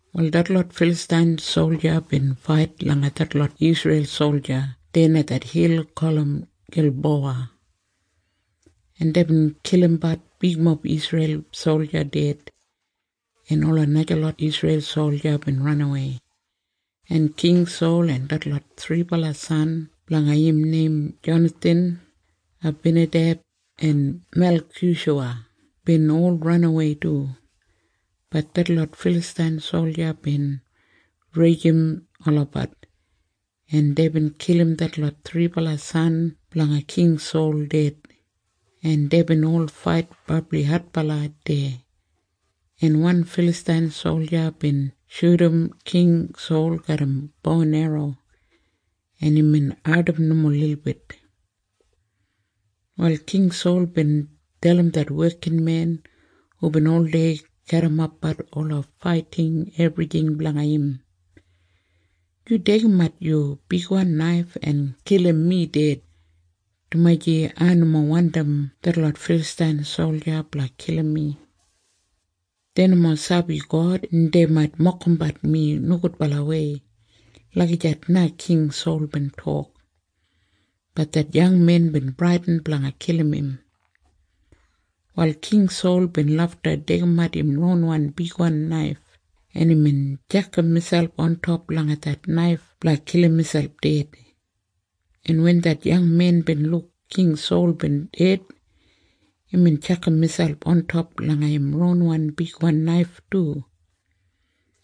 Wal detlot Filastain solja bin fait langa detlot Isreil solja deya langa det hil gulum Gilbowa, en deibin kilimbat bigmob Isreil solja ded, en ola najalot Isreil solja bin ranawei, en King Sol en detlot thribala san blanga im neim Jonathan, Abinadeb en Melkishuwa bin ol ranawei du. Bat detlot Filastain solja bin rijim olabat, en deibin kilim detlot thribala san blanga King Sol ded, en deibin ol fait brabli adbala deya, en wan Filastain solja bin shudum King Sol garram bo en erro, en imbin ardim nomo lilbit. Wal King Sol bin dalim det wekinmen hubin oldei garrimapbat ola faiting ebrjing blanga im, “Yu deigimat yu bigwan naif en kilim mi ded, dumaji ai nomo wandim detlot Filastain solja blanga kilim mi. Dei nomo sabi God, en dei mait mokimbat mi nogudbalawei.” Lagijat na King Sol bin tok. Bat det yangmen bin bradin blanga kilim im. Wal King Sol bin lafta deigimat im ronwan bigwan naif, en imbin tjakam miselp ontop langa det naif blanga kilim miselp ded, en wen det yangmen bin luk King Sol bin ded, imbin tjakam miselp ontop langa im ronwan bigwan naif du,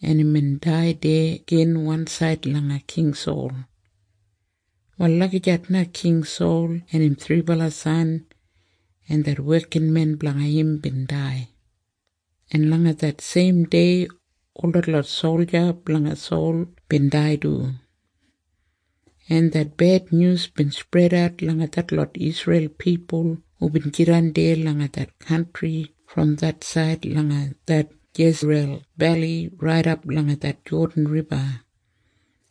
en imbin dai deya gin wansaid langa King Sol. Wal lagijat na King Sol en im thribala san en det wekinmen blanga im bin dai, en langa det seimdei ol detlot solja blanga Sol bin dai du, en det bednyus bin spredat langa detlot Isreil pipul hubin jidan deya langa det kantri brom det said langa det Jesriyel Beli raidap langa det Jodan Riba,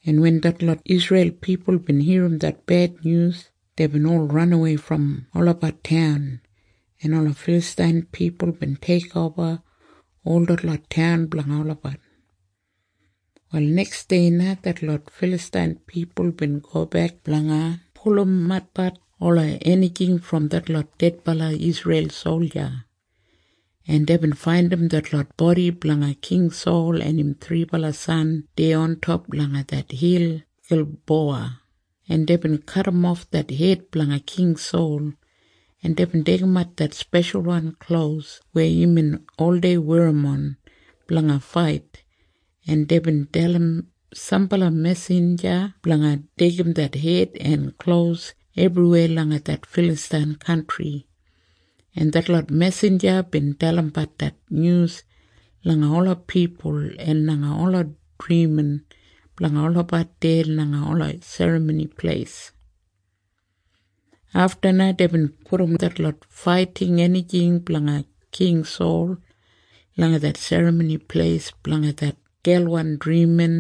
en wen detlot Isreil pipul bin irrim det bednyus, deibin ol ranawei brom olabat taun, en ola Filastain pipul bin teikoba ol detlot taun blanga olabat. Wal neksdei na detlot Filastain pipul bin gobek blanga pulumatbat ola enijing brom detlot dedbala Isreil solja, en deibin faindim detlot bodi blanga king Sol en im thribala san deya ontop langa det hil Gilbowa, en deibin kadimof det hed blanga King Sol, en deibin deigimat det speshalwan klos weya imbin oldei werrimon blanga fait, en deibin dalim sambala mesinja blanga deigim det hed en klos ebriweya langa det Filastain kantri, en detlot mesinja bin dalimbat det nyus langa ola pipul en langa ola drimin blanga olabat deya langa ola serramoni pleis. Afta na deibin pudum detlot faiting enijing blanga King Sol langa det serramoni pleis blanga det gelwan drimin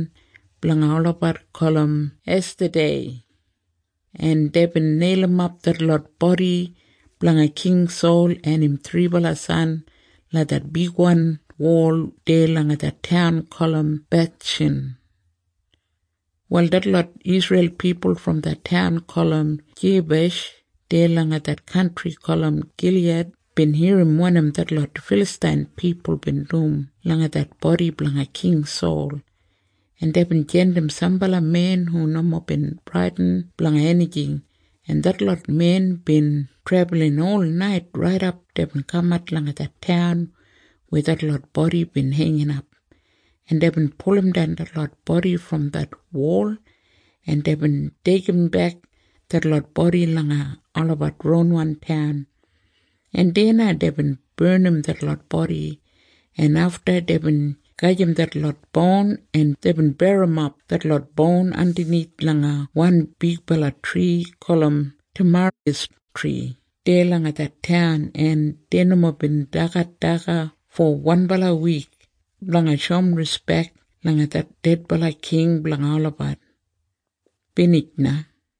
blanga olabat gulum Estatei, en deibin neilimap detlot bodi blanga King Sol en im thribala san langa det bigwan wol deya langa det taun gulum Bethshan. Wal detlot Isreil pipul brom det taun gulum Jeibesh deya langa det kantri gulum Giliyad bin irrim wanim detlot Filastain pipul bin dum langa det bodi blanga King Sol, en deibin jandim sambala men hu nomo bin bradin blanga enijing, en detlot men bin trebulin olnait raidap deibin kamat langa det taun weya detlot bodi bin heinginap, en deibin pulumdan detlot bodi brom det wol, en deibin deigimbek detlot bodi langa olabat ronwan taun, en deya na deibin barnim detlot bodi, en afta deibin gajim detlot boun, en deibin berrimap detlot boun andanith langa wan bigbala tri gulum temarisktri deya langa det taun, en dei nomo bin dagat daga fo wanbala wik blanga shoum rispek langa det dedbala king blanga olabat. Binij na.